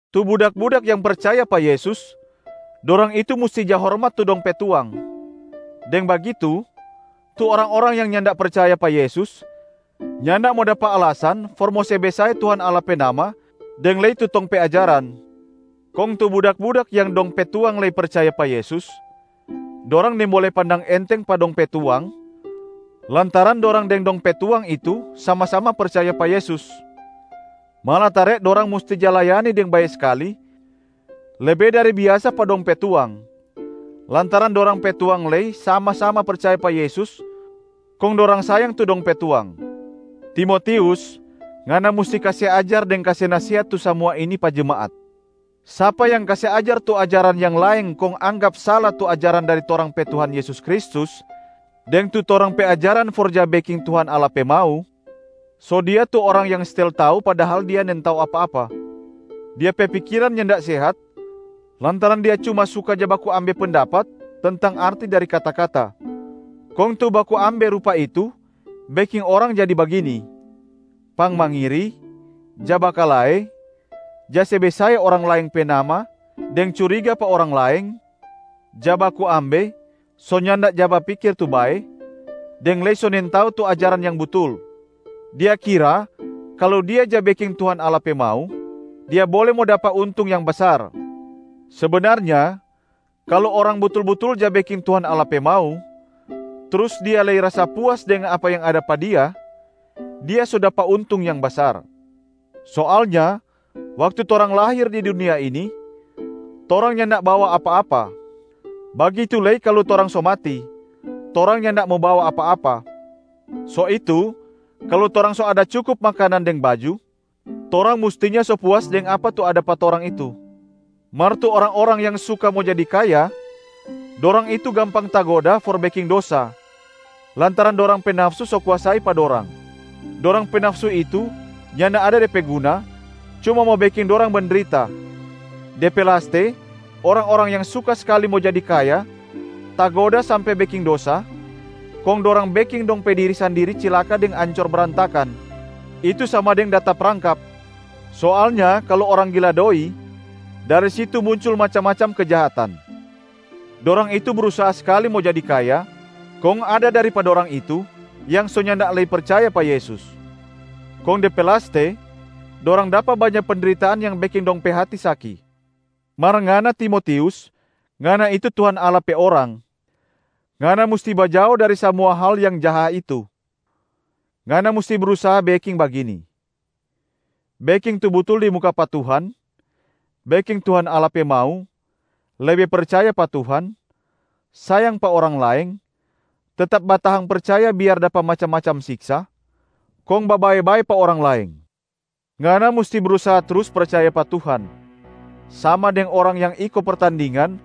Tu budak-budak yang percaya pa Yesus, dorang itu musti ja hormat tu dong pe tuang. Deng bagitu, tu orang-orang yang nyanda percaya pa Yesus nyanda mo dapa alasan for mo se besae Tuhan Allah pe nama deng lei tu tong pe ajaran. Kong tu budak-budak yang dong pe tuang lei percaya pa Yesus, dorang nimbole pandang enteng pa dong pe tuang lantaran dorang deng dong pe tuang itu sama-sama percaya pa Yesus. Malatare dorang musti ja layani deng bae skali lebe dari biasa pa dong pe tuang, lantaran dorang pe tuang lei sama-sama percaya pa Yesus kong dorang sayang tu dong pe tuang. Ajaran yang sala deng orang yang gila doi Timotius, ngana musti kase ajar deng kase nasehat tu samua ini pa jemaat. Sapa yang kase ajar tu ajaran yang laeng kong anggap sala tu ajaran dari torang pe Tuhan Yesus Kristus deng tu torang pe ajaran for ja beking Tuhan Allah pe mau, so dia tu orang yang stel tau padahal dia nintau apa-apa. Dia pe pikiran nyanda sehat lantaran dia cuma suka ja baku ambe pendapat tentang arti dari kata-kata. Kong tu baku ambe rupa itu beking orang jadi bagini: pangmangiri, ja bakalae, ja se besae orang laeng pe nama deng curiga pa orang laeng, ja baku ambe, so nyanda ja bapikir tu bae, deng lei so nintau tu ajaran yang butul. Dia kira kalu dia ja beking Tuhan Allah pe mau, dia bole mo dapa untung yang basar. Sebenarnya kalu orang butul-butul ja beking Tuhan Allah pe mau, trus dia lei rasa puas deng apa yang ada pa dia, dia so dapa untung yang basar. Soalnya waktu torang lahir di dunia ini, torang nyanda bawa apa-apa. Bagitu lei kalu torang so mati, torang nyanda mo bawa apa-apa. So itu, kalu torang so ada cukup makanan deng baju, torang mustinya so puas deng apa tu ada pa torang itu. Mar tu orang-orang yang suka mo jadi kaya, dorang itu gampang tagoda for beking dosa, lantaran dorang pe nafsu so kuasai pa dorang. Dorang pe nafsu itu nyanda ada de pe guna, cuma mo beking dorang mendrita. De pe laste orang-orang yang suka skali mo jadi kaya tagoda sampe beking dosa, kong dorang beking dong pe diri sandiri cilaka deng ancor brantakan, itu sama deng da taprangkap. Soalnya kalu orang gila doi, dari situ muncul macam-macam kejahatan. Dorang itu brusaha skali mo jadi kaya, kong ada dari pa dorang itu yang so nyanda lei percaya pa Yesus. Kong de pe laste, dorang dapa banya pendritaan yang beking dong pe hati saki. Mar ngana Timotius, ngana itu Tuhan Allah pe orang. Ngana musti bajao dari samua hal yang jaha itu. Ngana musti brusaha beking bagini: beking tu butul di muka pa Tuhan, beking Tuhan Allah pe mau, lebe percaya pa Tuhan, sayang pa orang laeng, tetap batahang percaya biar dapa macam-macam siksa, kong babae-bae pa orang laeng. Ngana musti brusaha trus percaya pa Tuhan, sama deng orang yang iko pertandingan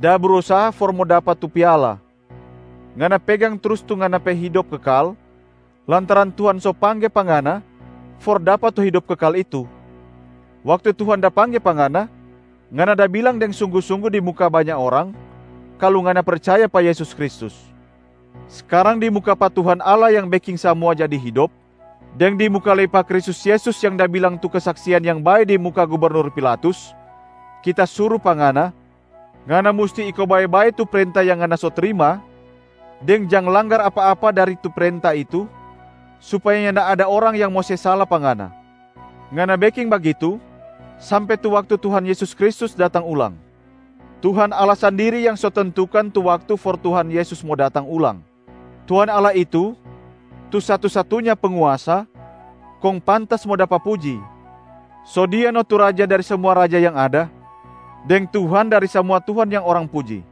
da brusaha for mo dapa tu piala. Ngana pegang trus tu ngana pe hidop kekal, lantaran Tuhan so pangge pa ngana for dapa tu hidop kekal itu. Waktu Tuhan da pangge pa ngana, ngana da bilang deng sunggu-sunggu di muka banya orang kalu ngana percaya pa Yesus Kristus. Skarang di muka pa Tuhan Allah yang beking samua jadi hidop, deng di muka lei pa Kristus Yesus yang da bilang tu kesaksian yang bae di muka gubernur Pilatus, kita suru pa ngana, ngana musti iko bae-bae tu prenta yang ngana so trima deng jang langgar apa-apa dari tu prenta itu supaya nyanda ada orang yang mo se sala pa ngana. Ngana beking bagitu sampe tu waktu Tuhan Yesus Kristus datang ulang. Tuhan Allah sandiri yang so tentukan tu waktu for Tuhan Yesus mo datang ulang. Tuhan Allah itu tu satu-satunya Penguasa, kong pantas mo dapa puji. So Dia no tu Raja dari samua raja yang ada, deng Tuhan dari samua tuhan yang orang puji.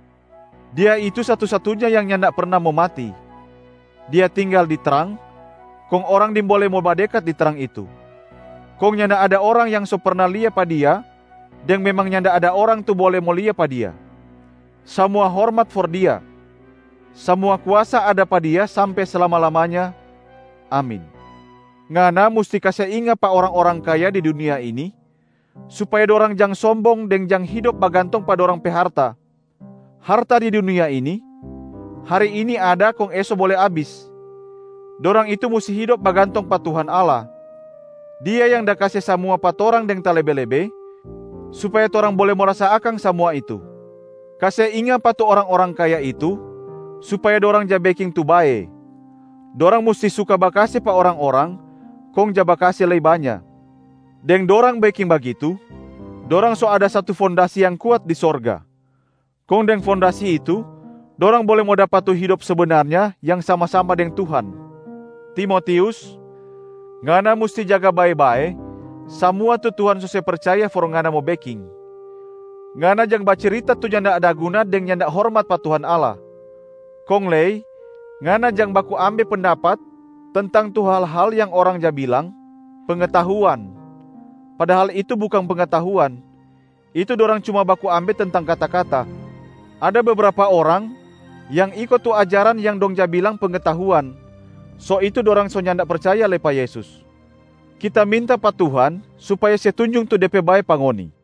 Dia itu satu-satunya yang nyanda perna mo mati. Dia tinggal di trang, kong orang nimbole mo badekat di trang itu. Kong nyanda ada orang yang so perna lia pa Dia deng memang nyanda ada orang tu bole mo lia pa Dia. Samua hormat for Dia. Samua kuasa ada pa Dia sampe slama-lamanya. Amin. Ngana musti kase inga pa orang-orang kaya di dunia ini, supaya dorang jang sombong deng jang hidop bagantong pa dorang pe harta. Harta di dunia ini, hari ini ada kong eso bole abis. Dorang itu musti hidop bagantong pa Tuhan Allah. Dia yang da kase samua pa torang deng talebe-lebe supaya torang bole mo rasa akang samua itu. Kase inga pa tu orang-orang kaya itu supaya dorang ja beking tu bae. Dorang musti suka bakase pa orang-orang kong ja bakase lei banya. Deng dorang beking bagitu, dorang so ada satu fondasi yang kuat di sorga, kong deng fondasi itu dorang bole mo dapa tu hidop sebenarnya yang sama-sama deng Tuhan. Timotius, ngana musti jaga bae-bae samua tu Tuhan so se percaya for ngana mo beking. Ngana jang bacirita tu nyanda ada guna deng nyanda hormat pa Tuhan Allah. Kong lei ngana jang baku ambe pendapat tentang tu hal-hal yang orang ja bilang “pengetahuan” padahal itu bukang pengetahuan, itu dorang cuma baku ambe tentang kata-kata. Ada bebrapa orang yang iko tu ajaran yang dong ja bilang “pengetahuan,” so itu dorang so nyanda percaya lei pa Yesus. Kita minta pa Tuhan supaya se tunjung tu De pe bae pa ngoni.